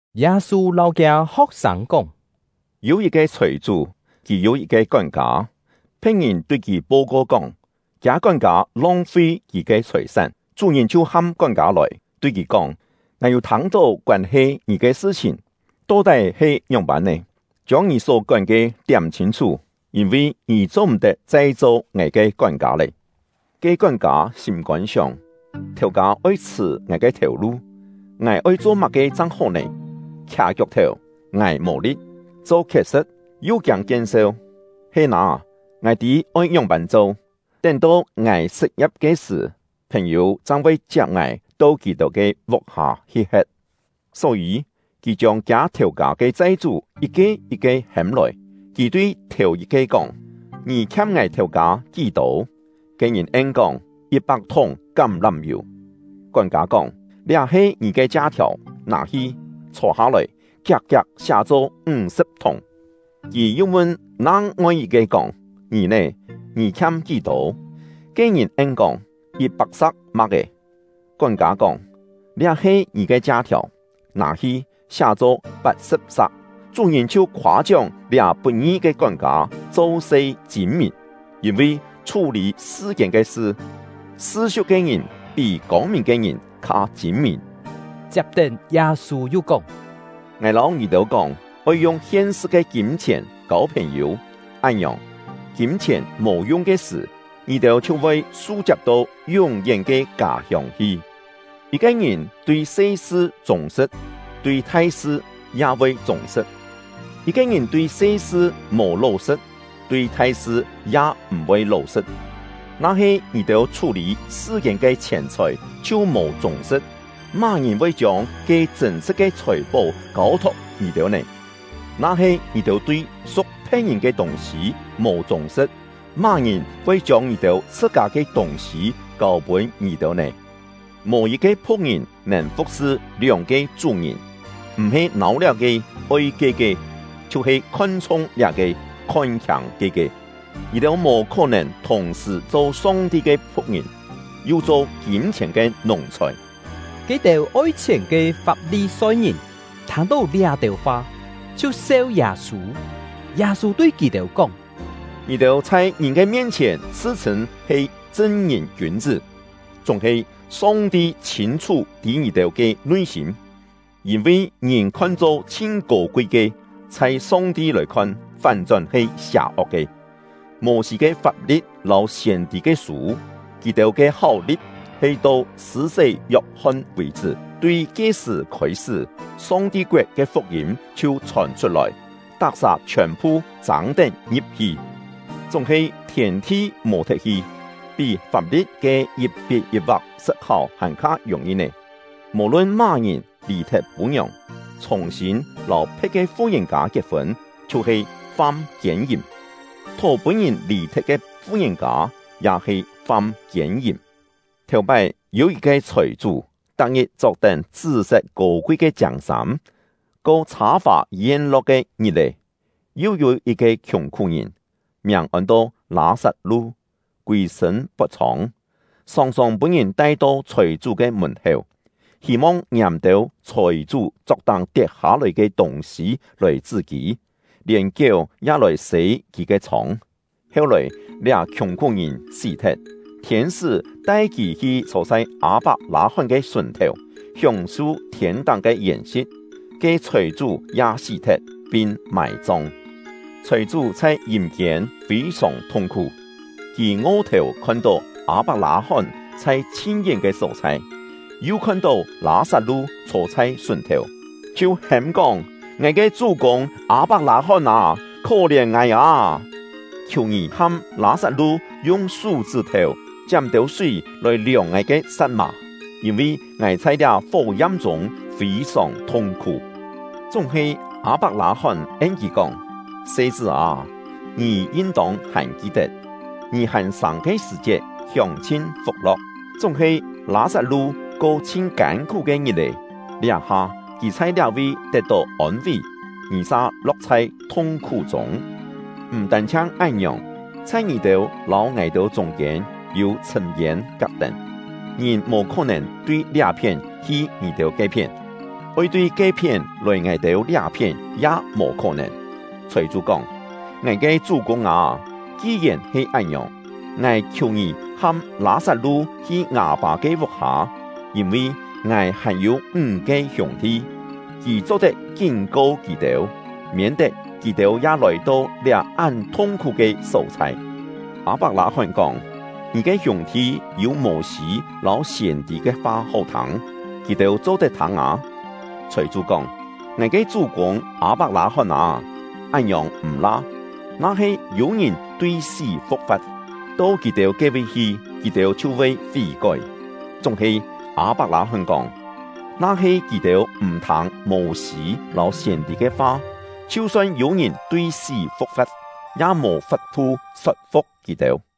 Yâ-sû lâu kiâ ho̍k-sâng kóng: “Yû yit-ke chhòi-chú, kì yû yit-ke kón-kâ; phe̍t-ngìn tui kì po-ko kóng, kiâ kón-kâ long-fi kì ke chhòi-sán. Chú-ngìn chhiu ham kón-kâ lòi, tui kì kóng: ‘Ngài yû thâng-tó koân-he ngì ke sṳ-chhìn, to-tái he ngióng-pân nè? Chiông ngì só kón ke tiám chhîn-chhú, yîn-vi ngì cho-m̀-tet chai cho ngài ke kón-kâ lé!’ Ke kón-kâ sîm-kôn sióng: ‘Thèu-kâ oi chhṳ̀ ngài ke thèu-lu! Ngài oi cho má-ke chang hó nè? Khià kiok-thèu, ngài mò li̍t; cho khiet-sṳ̍t, yu kiâng kien-seu. He nâ! Ngài tî oi ngióng-pân cho, tén-to ngài sṳt-ngia̍p ke sṳ̀, phèn-yû chang voi chiap ngài to kì-têu ke vuk-hâ hi he̍t.’ “Só-yî, kì chiông kiâ thèu-kâ ke chai-chú yit-ke yit-ke hêm lòi. Kì tui thèu-yit-ke kóng: ‘Ngì khiam ngài thèu-kâ kí-tô?’ Ke-ngìn en-kóng: ‘Yit-pak thúng kám-lám-yù.’ Kón-kâ kóng: ‘Liá he ngì ke chia-thiàu, nâ-hi, chhô-hâ-lòi, kiak-kiak siá-cho ńg-sṳ̍p thúng.’ Kì yu mun nang-ngoi yit-ke kóng: ‘Ngì nè, ngì khiam kí-tô?’ Ke-ngìn en-kóng: ‘Yit-pak sa̍k ma̍k-é.’ Kón-kâ kóng: ‘Liá he ngì ke chia-thiàu, nâ-hi, siá-cho pat-sṳ̍p sa̍k.’ “Chú-ngìn chhiu khoâ-chióng liá put-ngi ke kón-kâ cho-se chîn-mìn. Yîn-vi chhú-lî sṳ-kiên ke sṳ, sṳ-siu̍k ke ngìn pí kông-mìn ke ngìn kha chîn-mìn.” Chiap-tén, Yâ-sû yu kóng: “Ngài lâu ngì-têu kóng, oi yung hien-sṳ ke kîm-chhièn kâu phèn-yû, án-ngiòng, kîm-chhièn mò yung ke sṳ̀, ngì-têu chhiu voi su-chiap to yún-yén ke kâ-hiông hi. “Yit-ke ngìn tui se-sṳ chûng-sṳ̍t, tui thai-sṳ ya voi chûng-sṳ̍t; yit-ke ngìn tui se-sṳ mò ló-sṳ̍t, tui thai-sṳ ya m̀-voi ló-sṳ̍t. Na-he ngì-têu chhú-lî sṳ-kiên ke chhièn-chhòi chhiu mò chûng-sṳ̍t, má-ngìn voi chiông ke chṳ̂n-sṳ̍t ke chhòi-pó kâu-thok ngì-têu nè? Na-he ngì-têu tui su̍k phe̍t-ngìn ke tûng-sî mò chûng-sṳ̍t, má-ngìn voi chiông ngì-têu chhṳ-kâ ke tûng-sî kâu-pûn ngì-têu nè? “Mò yit-ke phu̍k-ngìn nèn fu̍k-sṳ lióng-ke chú-ngìn. M̀-he nâu liá-ke, oi ke-ke, chhiu-he khon-chhung liá-ke, khon-khiâng ke-ke. Ngì-têu mò khó-nèn thùng-sṳ̀ cho Song-ti ke phu̍k-ngìn, yu cho kîm-chhièn ke nùng-chhòi.” Ke-têu oi chhièn ke Fap-li-soi-ngìn thâng-tó liá-têu fa, chhiu seu Yâ-sû. Yâ-sû tui kì-têu kóng: “Ngì-têu chhai ngìn ke mien-chhièn chhṳ-chhṳ̂n he chṳn-ngìn kiûn-chṳ́, chúng-he Song-ti chhîn-chhú tî ngì-têu ke nui-sîm; yîn-vi ngìn khon-cho chhin kô-kui ke, chhai Song-ti lòi khon fán-chón he sià-ok ke. “Mô-sî ke fap-li̍t lâu siên-tî ke sû, kì-têu ke háu-li̍t he to Sṳ̂-sé Yok-hon vì-chṳ́; tui ke-sṳ̀ khôi-sṳ́, Song-ti koet ke fuk-yîm chhiu chhòn chhut-lòi, tak-sà chhiòn-phu châng-tén ngi̍p-hi. Chúng-he thiên-thi mò-thet-hi, pí fap-li̍t ke yit-pit yit-va̍k sṳt-háu hàn-kha yùng-yi nè! “Mò-lun má-ngìn lì-thet pû-ngiòng, chhùng-sîn lâu phe̍t ke fu-ngìn-kâ kiet-fûn, chhiu-he fam kiên-yìm; thó pûn-ngìn lì-thet ke fu-ngìn-kâ ya he fam kiên-yìm. “Thèu-pái yû yit-ke chhòi-chú, tak-ngit chok-tén chṳ́-set kô-kui ke chiâng-sâm, ko chhâ-fà yen-lo̍k ke ngit-è. Yu yû yit-ke khiùng-khú-ngìn, miàng ôn-to Lâ-sat-lu, kûi-sṳ̂n pot-chhông, sòng-sòng pûn-ngìn tai-to chhòi-chú ke mùn-héu, hî-mong ngiâm têu chhòi-chú chok-táng tiet-hâ-lòi ke tûng-sî lòi chṳ́-kî; lièn kiéu ya lòi sê kì ke chhông. “Heu-lòi, liá khiùng-khú-ngìn sí-thet, thiên-sṳ́ tai kì hi chhô chhai Â-pak-lâ-hón ke sùn-thèu, hióng-su thiên-táng ke yèn-si̍t; ke chhòi-chú ya sí-thet, pin mài-chong. Chhòi-chú chhai yîm-kiên fî-sòng thung-khú; kì ngo-thèu khon-tó Â-pak-lâ-hón chhai chhin-yén ke só-chhai, yu khon-tó Lâ-sat-lu chhô chhai sùn-thèu, chhiu hêm-kóng: ‘Ngài ke chú-kûng Â-pak-lâ-hón â, khó-lièn ngài â! Khiù ngì ham Lâ-sat-lu yung sú-chṳ́-thèu chiám têu súi lòi liòng ngài ke sa̍t-mà, yîn-vi ngài chhai liá fó-yam-chûng fî-sòng thung-khú!’ “Chúng-he Â-pak-lâ-hón en kì kóng: ‘Se-chṳ́ â, ngì yin-tông hàn ki-tet, ngì hàn sâng ke sṳ̀-chiet hióng-chhin fuk-lo̍k, chúng-he Lâ-sat-lu ko chhin kân-khú ke ngit-è; liá-ha kì chhai liá-vi tet-tó ôn-ví, ngì sa lo̍k chhai thung-khú-chûng. M̀ tân-chhiang án-ngiòng, chhai ngì-têu lâu ngài-têu chûng-kiên yû chhṳ̂m-yên kak-tén, ngìn mò khó-nèn tui liá-phién hi ngì-têu ke-phién; oi tui ke-phién lòi ngài-têu liá-phién ya mò khó-nèn.’ Chhòi-chú kóng: ‘Ngài ke chú-kûng â, ki-yèn he án-ngiòng, ngài khiù ngì ham Lâ-sat-lu hi ngâ-pâ ke vuk-hâ; yîn-vi ngài hàn-yû ńg-ke hiûng-thi, kì cho-tet kín-ko kì-têu, miên-tet kì-têu ya lòi-to liá án thung-khú ke só-chhai.’ “Â-pak-lâ-hón kóng: ‘Ngì ke hiûng-thi yû Mô-sî lâu siên-tî ke fa hó thâng, kì-têu cho-tet thâng â!’ Chhòi-chú kóng: ‘Ngài ke chú-kûng Â-pak-lâ-hón â, án-ngiòng m̀-la! Na-he yû ngìn tui sí fu̍k-fa̍t, to kì-têu ke-vi hi, kì-têu chhiu voi fí-kói.’ Chúng-he Â-pak-lâ-hón kóng: ‘Na-he kì-têu m̀ thâng Mô-sî lâu siên-tî ke fa, chhiu-son yû ngìn tui sí fu̍k-fa̍t, ya mò fap-thu sot-fu̍k kì-têu!’”